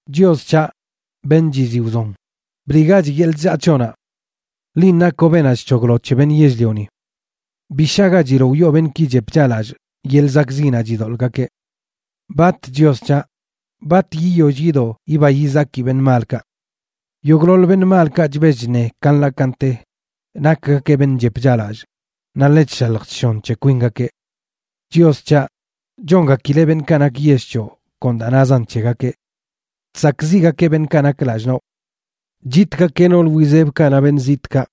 Chios c̱haꞌ, beṉꞌ chiziꞌ wzon, bliꞌgach yeḻꞌ chllaa c̱hoꞌnaꞌ. Linꞌ nakoꞌ beenaꞌ chc̱hoglo c̱he beṉꞌ yell-lioni. ¡Bi shagachiloꞌ wiꞌo beṉꞌki chep chaꞌlallꞌ yeḻꞌ zakꞌziꞌnaꞌ chidoḻꞌgakeꞌ! ¿Bat, Chios c̱haꞌ, bat yiyoll yido yiba yizaki beṉꞌ malka? Yogꞌḻoḻ beṉꞌ malkaꞌ chbell chṉe ka nḻaꞌ ka nte, nakgakeꞌ beṉꞌ chep chaꞌlallꞌ naꞌ ḻe chshalj chshon c̱he kwingakeꞌ. Chios c̱haꞌ, chongakileꞌ beṉꞌkaꞌ nak yell c̱hoꞌ kon da nazan c̱hegakeꞌ. ¡Chsakꞌziꞌgakeꞌ beṉꞌkaꞌ nak lallꞌ noꞌ! Chitgakeꞌ nool wizebkaꞌ naꞌ beṉꞌ zitꞌkaꞌ;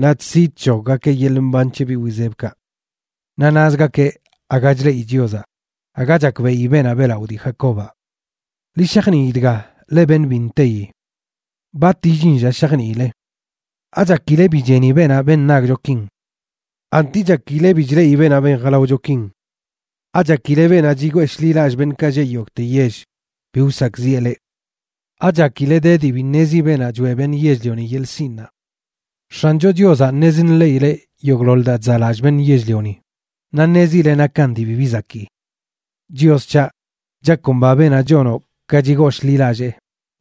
naꞌ chsi chc̱hoggakeꞌ yeḻꞌ mban c̱he biꞌ wizebkaꞌ. Naꞌ nazgakeꞌ aga chleꞌi Chiozaꞌ, aga chakbeꞌi beenaꞌ beꞌlaꞌo dii Jacobaꞌ. ¡Ḻi shajnii dga, leꞌ beṉꞌ bi nteyi! ¿Bat illin lla shajniile? ¿Achakile bi cheni beenaꞌ ben nagchokin? ¿Anti chakileꞌ bi chleꞌi beenaꞌ ben jalaochokin? ¿Achakile beenaꞌ chigoo shḻilallꞌ beṉꞌkaꞌ lleꞌ yogꞌte yell bi wsakꞌziꞌe leꞌ? ¿Achakile de dii bi ṉezi beenaꞌ choeꞌ beṉꞌ yell-lioni yeḻꞌ sinꞌnaꞌ? X̱ancho Chiozaꞌ ṉez nḻeꞌileꞌ yogꞌḻoḻ daa chzaꞌlallꞌ beṉꞌ yell-lioni, naꞌ ṉezileꞌ nakan dii bibi zakii. Chios c̱haꞌ, chakomba beenaꞌ chonoꞌ ka chigooshḻilallee,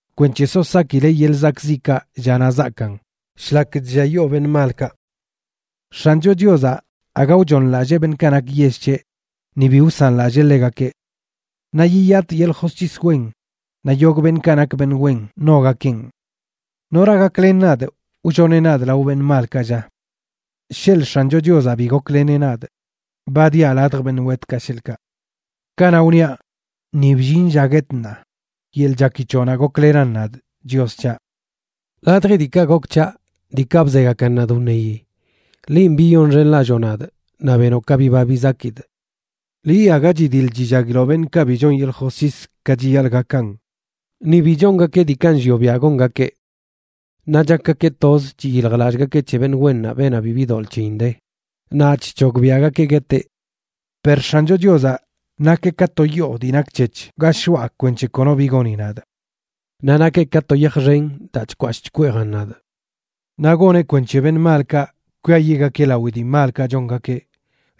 kwenc̱he so sakileꞌ yeḻꞌ zakꞌziꞌkaꞌ llanaꞌ zaakan, shlak chlliayoo beṉꞌ malkaꞌ. X̱ancho Chiozaꞌ aga wchooṉlallee beṉꞌkaꞌ nak yell c̱heꞌ, ni bi wsanlallee ḻegakeꞌ. Naꞌ yiyatꞌ yeḻꞌ josc̱his wen, naꞌ yogꞌ beṉꞌkaꞌ nak beṉꞌ wen ṉogakeꞌn. ¿Nora gaklen nadꞌ wlloneꞌ nadꞌ lao beṉꞌ malkaꞌ, lla? Sheḻꞌ X̱ancho Chiozaꞌ bi gokleneꞌ nadꞌ, ba diaꞌ ladj beṉꞌ wetkaꞌ, sheḻꞌkaꞌ. Kanaꞌ wniaꞌ: “Ni bllin lla guetꞌ ṉaa”, yeḻꞌ chaki c̱hoꞌnaꞌ goklenan nadꞌ, Chios c̱haꞌ. Ladji diikaꞌ gok c̱haꞌ, diikaꞌ bzegakan nadꞌ wṉeyi, linꞌ biyonxenlalloo nadꞌ naꞌ benoꞌ ka biba bizakidꞌ. Liꞌ aga chidiḻ chillaguiloꞌ beṉꞌkaꞌ bi chon yeḻꞌ josc̱his ka chiyaḻꞌ gakan, ni bi chongakeꞌ diikaꞌ nllioꞌ biaꞌ gongakeꞌ, naꞌ chakgakeꞌ toz chiyiljlallꞌgakeꞌ c̱he beṉꞌ wennaꞌ, beenaꞌ bibi doḻꞌ c̱heyin de, naꞌ chc̱hogbiaꞌgakeꞌ gueteꞌ. Per X̱ancho Chiozaꞌ, nakeꞌ ka to yoo dii nak c̱hec̱h ga shoꞌa kwenc̱he kono bi goni nadꞌ. Naꞌ nakeꞌ ka to yaj xen daa chkwashꞌ chkweejan nadꞌ. Naꞌ goneꞌ kwenc̱he beṉꞌ malkaꞌ kwiayiꞌgakeꞌ lawi dii malkaꞌ chongakeꞌ.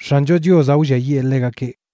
X̱ancho Chiozaꞌ wlliayee ḻegakeꞌ.